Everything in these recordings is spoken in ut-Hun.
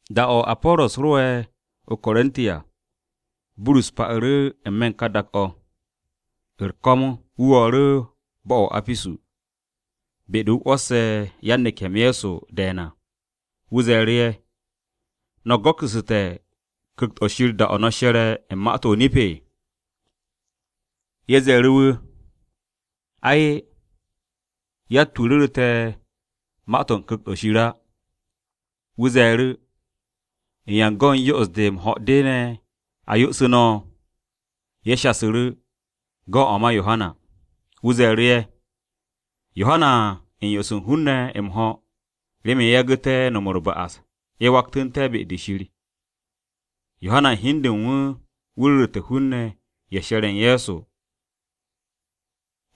Da-o̱ Apo̱ro̱s ro'e̱ o-Korinti à, Burus pa'u̱ru̱ n-me̱ u̱n ka dak-o̱. U̱r-ko̱m wu̱ wo̱o̱ru̱ bo̱-o̱ o-Apisu, be-de wu̱ 'wo̱sse̱ yan-neke̱-m Ye̱so de̱e̱n à. Wu̱ ze̱e̱ru̱ ye̱, “¿No̱ go̱ksu̱su̱te̱ Ku̱kt-o̱ Shir da-o̱ no̱ she̱re̱ u̱n ma-to̱ o-nip?” Ye̱ ze̱e̱ru̱ wu̱, “Ay, yatt-wu̱ ru̱ru̱te̱ ma-to̱ u̱n Ku̱kt-o̱ Shir á.” Wu̱ ze̱e̱ru̱, “¿Yan go̱n yo'os-de m-ho̱ de ne̱ a yo'osu̱ no̱?” Ye̱ shasu̱ru̱ “Go̱n de ma Yohana.” Burus ze̱e̱ru̱, “Yohana u̱n yo'os hun-ne̱ m-ho̱ remen ye̱ yagu̱té̱ no̱m u̱r-ba'as ye̱ waktu̱ne̱ be-de Shir. Yohana u̱n hi u̱n de u̱n wu̱ ru̱ru̱te̱ hun-ne̱ ye̱ she̱r u̱n Ye̱so,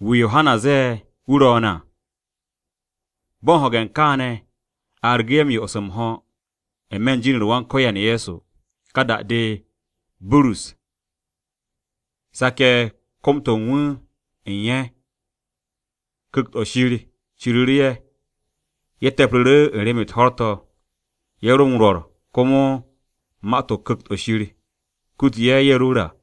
wu̱ Yohana zee ‘Wu̱ ro̱o̱n’ à.” Bo̱ m-ho̱ge̱ kaane̱, a argu̱ ye̱ m-yo'os m-ho̱ n-me̱ u̱n jin-u̱r Wan-Ko̱yan Ye̱so. Ka da-de, Burus sake̱ kom-to̱ u̱n wu̱ u̱n ye̱, Ku̱kt-o̱ Shir ciriru̱ u̱n ye̱. Ye̱ te̱pru̱ru̱ u̱n rem-u̱t ho̱r-to̱, ye̱ ro m-rwo̱r komo ma-to̱ Ku̱kt-o̱ Shir kutu ye̱, ye̱ ru̱r à.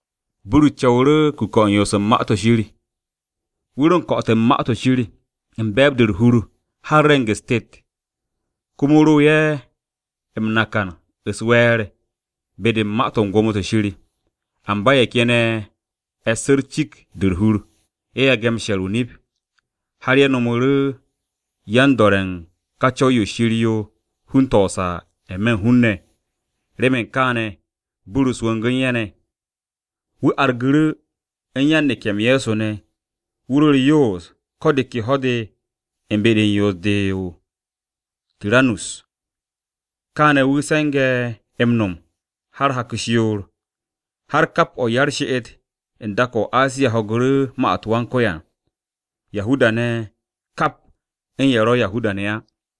Burus co̱wu̱ru̱ u̱n kuke̱-o̱ u̱n yoos u̱n Ma-to̱ Shir. Wu̱ ro m-ko̱'o̱te̱ u̱n Ma-to̱ Shir u̱n be̱e̱b-de u̱r-hur har re̱ng-u̱s tet. Komo wu̱ ro ye̱ m-nakan u̱s-we̱e̱r be-de u̱n ma-to̱ u̱n Gwo̱mo-to̱ Shir. Amba ye̱ ken ye̱ e̱ssu̱ cikt-de u̱r-hur, ye̱ yage̱ m-she̱r o-nip. Har ye̱ nomu̱ru̱ yan-do̱re̱ u̱n ka Co̱w-yo Shir yo hun-to̱ o-saa n-me̱ u̱n hun-ne̱. Remen kaane̱ Burus wongu̱ u̱n ye̱ ne̱. Wu̱ argu̱ru̱ u̱n yan-neke̱-m Ye̱so ne̱, wu̱ ro u̱r-yoos ko̱ de ke ho̱-de u̱n be-de u̱r-yoos de o-Tiranus. Kaane̱ wu̱ se̱nge̱ m-no̱m har hak-u̱s yoor, har kap o̱ u̱n ya-u̱r-she'et u̱n dak-o̱ o-Asiya ho̱gu̱ru̱ ma-u̱t Wan-Ko̱yan, Yahuda-ne̱ u̱n kap ye̱ ro̱ Yahuda-ne̱ ne̱ á.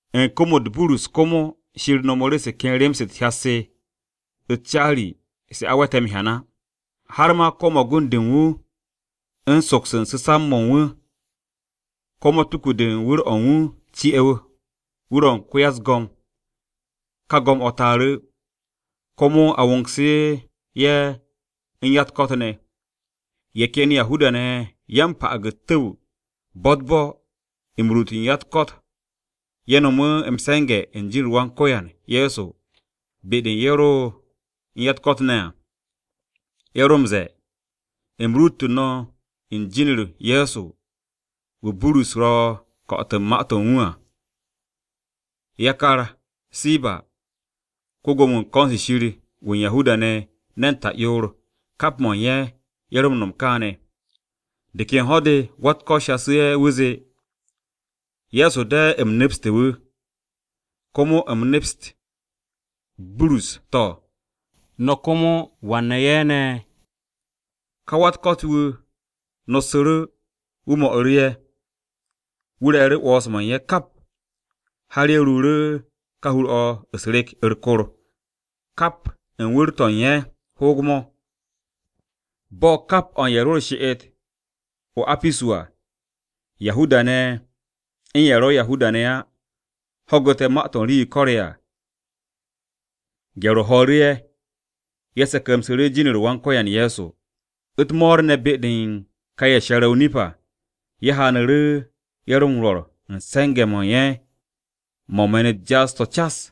U̱n kom-u̱t Burus komo Shir no̱mu̱ru̱ se ken rem-se u̱t-hyat se, u̱s-caari se a we̱te̱ m-hyan á. Har ma ko̱ magund-de u̱n soks u̱n su̱samb-mo̱ u̱n wu̱, ko̱ matuku-de u̱n wu̱r-o̱ u̱n wu̱ ci'e̱ wu̱r-o̱ u̱n ya-u̱s-go̱m ka go̱m-o̱ taaru̱, komo a wongsu̱ ye̱ u̱n ya-u̱t-ko̱t ne̱. Ye̱ ken Yahuda-ne̱ ye̱ ya-m-pa'ag u̱t-tu̱w bo̱-u̱t-bo̱ m-ruut u̱n ya-u̱t-ko̱t ye̱ no̱mu̱ m-se̱nge̱ u̱n jin-u̱r Wan-Ko̱yan Ye̱so be-de u̱n ye̱ ro u̱n ya-u̱t-ko̱t ne̱ à. Ye̱ ro m-ze̱e̱, “U̱m ruutu̱ no̱ u̱n jin-u̱r Ye̱so wu̱ Burus ro̱ m-ko̱'o̱t u̱n wu̱ à.” Yakar Siba ko-Gwo̱mo-wu̱ u̱n ko̱n-se Shir wu̱ u̱n Yahuda-ne̱ ne̱n ta'yoor, kap mo̱ u̱n ye̱, ye̱ ro m-no̱m kaane̱. De ken ho̱-de, wa-u̱t-ko̱t shasu̱ ye̱, wu̱ zee, “Ye̱so de u̱m nepstu̱ wu̱, komo u̱m neps Burus, to̱, no̱ komo ¿wan ne̱ ye̱ ne̱?” Ka wan-ya-u̱t-ko̱t-wu̱ nossu̱ru̱, wu̱ mo̱'u̱ru̱ ye̱. Wu̱ re̱e̱ru̱ 'wo̱ns-mo̱ u̱n ye̱ kap, har ye̱ ruuru̱ ka hur-o̱ u̱s-rek u̱t-kor, kap o̱ u̱n wu̱r-to̱ u̱n ye̱ hoog-mo̱. Bo̱ kap o̱ u̱n ye̱ ro u̱r-she'et o-Apisu à, Yahuda-ne̱ u̱n ye̱ ro̱ Yahuda-ne̱ á, ho̱gu̱te̱ ma-to̱ u̱n ka rii-yo ko̱re̱ à. Gye̱r-o ho̱o̱ru̱ ye̱, ye̱ se̱ke̱msu̱ru̱ jin-u̱r Wan-Ko̱yan Ye̱so. U̱t-mo̱o̱r ne̱ be-de u̱n ka ye̱ she̱re̱ o-nip à, ye̱ haanu̱ru̱ ye̱ ro m-rwo̱r u̱n se̱nge̱-mo̱ u̱n ye̱ mo̱ u̱n me̱n-u̱t jaas-to̱ cas.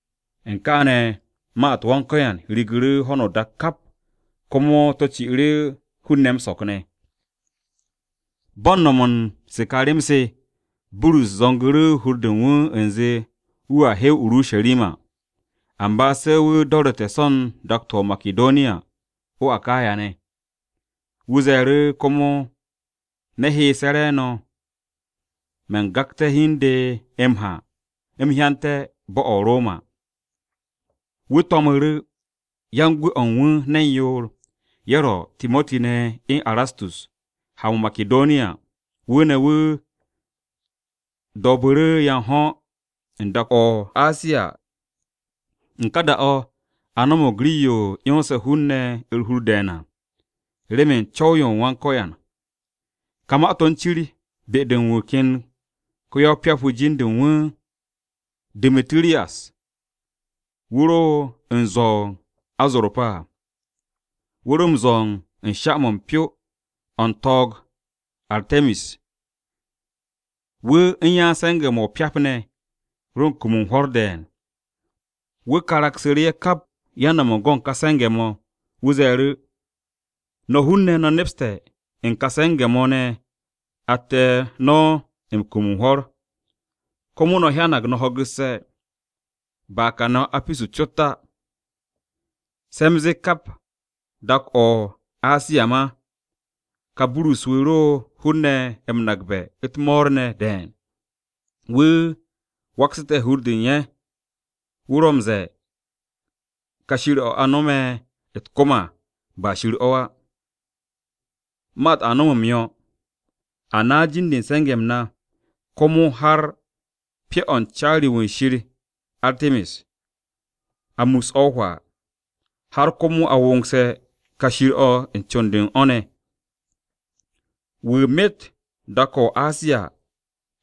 U̱n kaane̱ ma-u̱t Wan-Ko̱yan rige̱ ho̱no o-dak kap komo to̱ ci'u̱ru̱ hun-ne̱ m-so̱k ne̱. Bo̱ u̱n no̱m-mo̱ u̱n se ka rem-se, Burus zo̱ngsu̱ru̱ hur-de u̱n wu̱ u̱nze wu̱a he o-Urusharima, amba se̱ wu̱ do̱ru̱te̱ so̱ u̱n dak-to̱ o-Makidoniya o-Akaya ne̱. Wu̱ ze̱e̱ru̱, “Komo me̱ heese̱ re̱e̱no̱, man gagte̱ hi u̱n de m-ha u̱m hyante̱ bo̱-o̱ o-Roma.” Wu̱ to̱mu̱ru̱ yan-gwu̱-o̱ u̱n wu̱ ne̱n yoor, ye̱ ro, Timoti ne̱ u̱n Erastus, ha-mo̱ o-Makidoniya, wu̱ ne̱ wu̱ do̱o̱bu̱ru̱ ya o-da u̱n dak-o̱ o-Asiya. U̱n ka da-o̱, a no̱mo̱g rii-yo 'yonse̱ hun-ne̱ u̱r-hur de̱e̱n à, remen u̱n Co̱w-o u̱n Wan-Ko̱yan. Ka ma-to̱ u̱n cir be-de u̱n wu̱ ken ko-ya-o-pyap-wu̱ jin-de u̱n wu̱ Du̱mitu̱riyas. Wu̱ ro u̱n zwo̱ u̱n azorpa à, wu̱ ro m-zwo̱ u̱n sha-mo̱ u̱n pyo-o̱ u̱n to̱o̱g-o Arte̱mis. Wu̱ u̱n yan-se̱nge̱-mo̱ o-pyap ne̱ ro u̱n kum u̱n hwo̱r de̱e̱n. Wu̱ karagsu̱ru̱ ye̱ kap yan-no̱m u̱n gon ka se̱nge̱-mo̱. Wu̱ ze̱e̱ru̱, “No̱ hun-ne̱, no̱ nepste̱ u̱n ka se̱nge̱-mo̱ ne̱ atte̱ no̱ m-kum u̱n hwo̱r. Komo no̱ hyanag no̱ ho̱gu̱sse̱, ba kane̱ o-Apisu cot á, se̱ u̱m zee kap dak-o̱ o-Asiya ma. Ka Burus-wu̱ ro̱ hun-ne̱ m-nakbe̱ u̱t-mo̱o̱r ne̱ de̱e̱n. Wu̱ waksu̱te̱ hur-de u̱n ye̱, wu̱ ro̱ m-ze̱e̱ ka shir-o̱ a no̱me̱ u̱t-kom à, ba shir o̱ á. Ma-u̱t a no̱m m-yo̱. A naas jin-de u̱n se̱nge̱-m na, komo har u̱n pyo-o̱ u̱n caari-wu̱ u̱n shir Arte̱mis. A mus o̱ hwaa, har komo a wongse̱ ka shir-o̱ u̱n con-de u̱n o̱ ne̱. Wu̱ myet dak-o̱ o-Asiya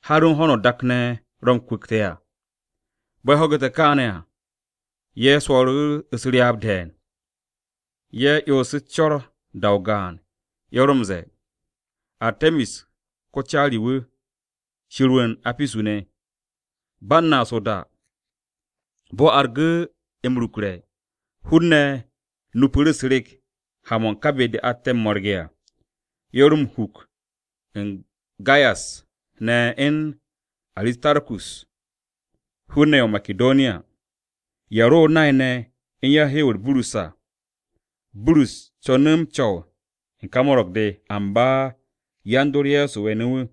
har u̱n ho̱no o-dak ne̱ ro̱ wu̱ m-kwu̱kte̱ à.” Bo̱ ye̱ ho̱gu̱te̱ kaane̱ à, ye̱ swo̱o̱ru̱ u̱s-ryaab de̱e̱n, ye̱ 'yonsu̱ u̱s-co̱r da-o gaan ye̱ ro m-ze̱e̱, “Arte̱mis ko-caari-wu̱, shir-wu̱ u̱n Apisu-ne̱!” Ba u̱n naas o-da, bo̱-o argu̱ m-rukre̱. Hun-ne̱ nupu̱ru̱ u̱s-rek ha-mo̱ u̱n ka be-de atte̱ m-mo̱rge̱ à. Ye̱ ro m-huk u̱n Gayas ne̱ u̱n Aristarkus, hun-ne̱ ye̱ o-Makidoniya, ye̱ ro nay-ne̱ u̱n yan-hew-u̱r Burus ne̱ à. Burus conu̱ m-co̱w u̱n ka mo̱ro̱g-de, amba yan-dor Ye̱so we̱nu̱ wu̱.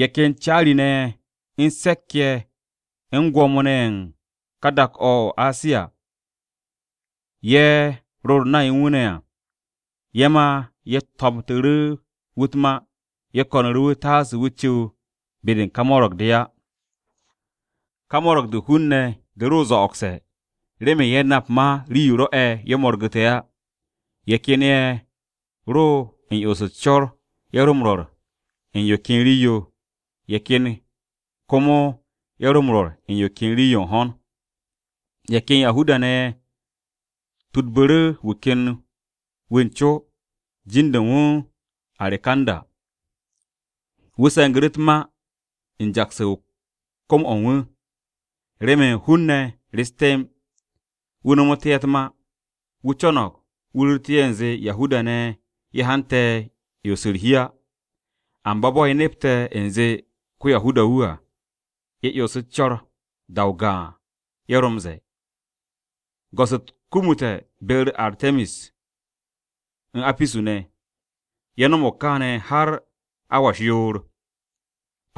Ye̱ ken caari-ne̱ ye̱ u̱n se̱k-ye̱ u̱n gwo̱mo-ne̱ ye̱ u̱n dak-o̱ o-Asiya, ye̱ ro u̱r-nay u̱n wu̱ ne̱ à. Ye̱ ma ye̱ tomtu̱ru̱ wu̱ u̱t-ma, ye̱ ko̱nu̱ru̱ wu̱ taase wu̱ cu̱w be-de u̱n ka mo̱ro̱g-de á. Ka mo̱ro̱g-de u̱n hun-ne̱ de ro zo̱'o̱gse̱, remen ye̱ nap ma rii-yo rwo̱'e̱ ye̱ mo̱rgu̱te̱ á. Ye̱ ken ye̱ ro u̱n 'yons u̱s-co̱r ye̱ ro m-rwo̱r u̱n yo ken rii-yo, ye̱ ken komo ye̱ ro m-rwo̱r u̱n yo ken rii-yo u̱n ho̱n. Ye̱ ken Yahuda-ne̱ ye̱ tudbu̱ru̱ wu̱ ken wu̱ u̱n co, jin-de u̱n wu̱ Arekanda. Wu̱ se̱ngu̱ru̱ u̱t-ma u̱n jaksu̱ u̱n kom-o̱ wu̱, remen hun-ne̱ rest temb, wu̱ nomu̱té̱ ye̱ u̱t-ma. Wu̱ co̱no̱g wu̱ ru̱ru̱tu̱ ye̱ u̱nze Yahuda-ne̱ ye̱ hante̱ 'yons u̱r-hi á. Amba bo̱ ye̱ nepte̱ u̱nze ko-Yahuda-wu̱ à, ye̱ 'yonsu̱ u̱s-co̱r. Da-o gaan ye̱ ro m-ze̱e̱, “Go̱s-u̱t kumute̱ be-u̱r Arte̱mis u̱n Apisu-ne̱!” Ye̱ no̱mo̱g kaane̱ har awa u̱s-yoor.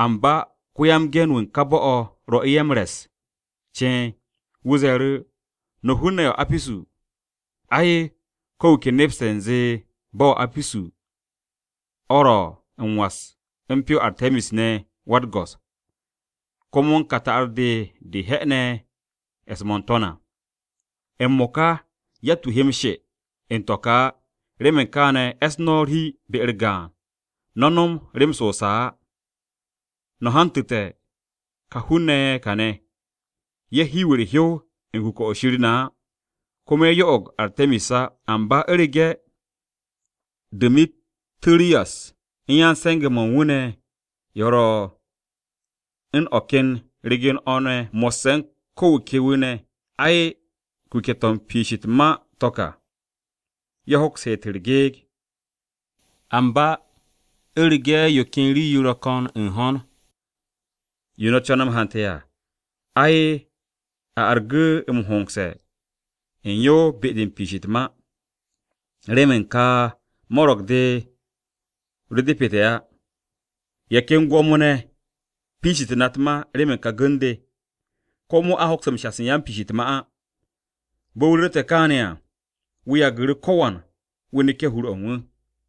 Amba ko-ya-m-ge̱n-wu̱ u̱n ka bo̱-o̱ rwo̱'u̱ ye̱ m-re̱s ceen. Wu̱ ze̱e̱ru̱, “No̱ hun-ne̱ ye̱ o-Apisu! Ai, ko̱ wu̱ ke nepste̱ u̱nze bo̱-o̱ o-Apisu o̱ ro̱ m-was u̱n pyo-o Arte̱mis ne̱ wa-u̱t-go̱s, komo u̱n ka ta'ar-de ne̱ de he'ene̱ e̱s-mo̱ n-To̱n à. M-mo̱ka yatt-wu̱ he m-she u̱n to̱ ka á, remen kaane̱ e̱ss no̱ u̱r-hi be-u̱r gaan, no̱ no̱m rem-se o-saa á. No̱ hantu̱te̱ kà hun-ne̱ ye̱ kaane̱. Ye̱ hiw u̱r-hyow u̱n kuke̱-o̱ u̱n shir na á, komo ye̱ yo'og Arte̱mis á. Amba, u̱rege̱ Du̱mitu̱riyas u̱n yan-se̱nge̱-mo̱ u̱n wu̱ ne̱ ye̱ ro̱ u̱n o̱ ken ryegen-o̱ ne̱ mo̱sse̱ u̱n wu̱ ken wu̱ ne̱, ai, kuke̱-to̱ u̱n piish u̱t-ma to̱ ka, ye̱ hoks heet u̱r-gyekt. Amba u̱rege̱ yo ken rii-yo ro̱ ko̱n u̱n ho̱n, yo no̱ co̱ne̱ m-hante̱ à, ai a argu̱ m-hongse̱ u̱n yo be-de u̱n piish u̱t-ma. Remen ka mo̱ro̱g-de ro depete̱ á. Ye̱ ken gwo̱mo-ne̱ piishité̱ na u̱t-ma remen ka gu̱n-de. Komo a hoks m-shas yan-piishe̱ u̱t-ma á.” Bo̱ wu̱ ru̱rte̱ kaane̱ à, wu̱ yagu̱ru̱ ko̱wan wu̱ neke̱ hur-o̱ u̱n wu̱.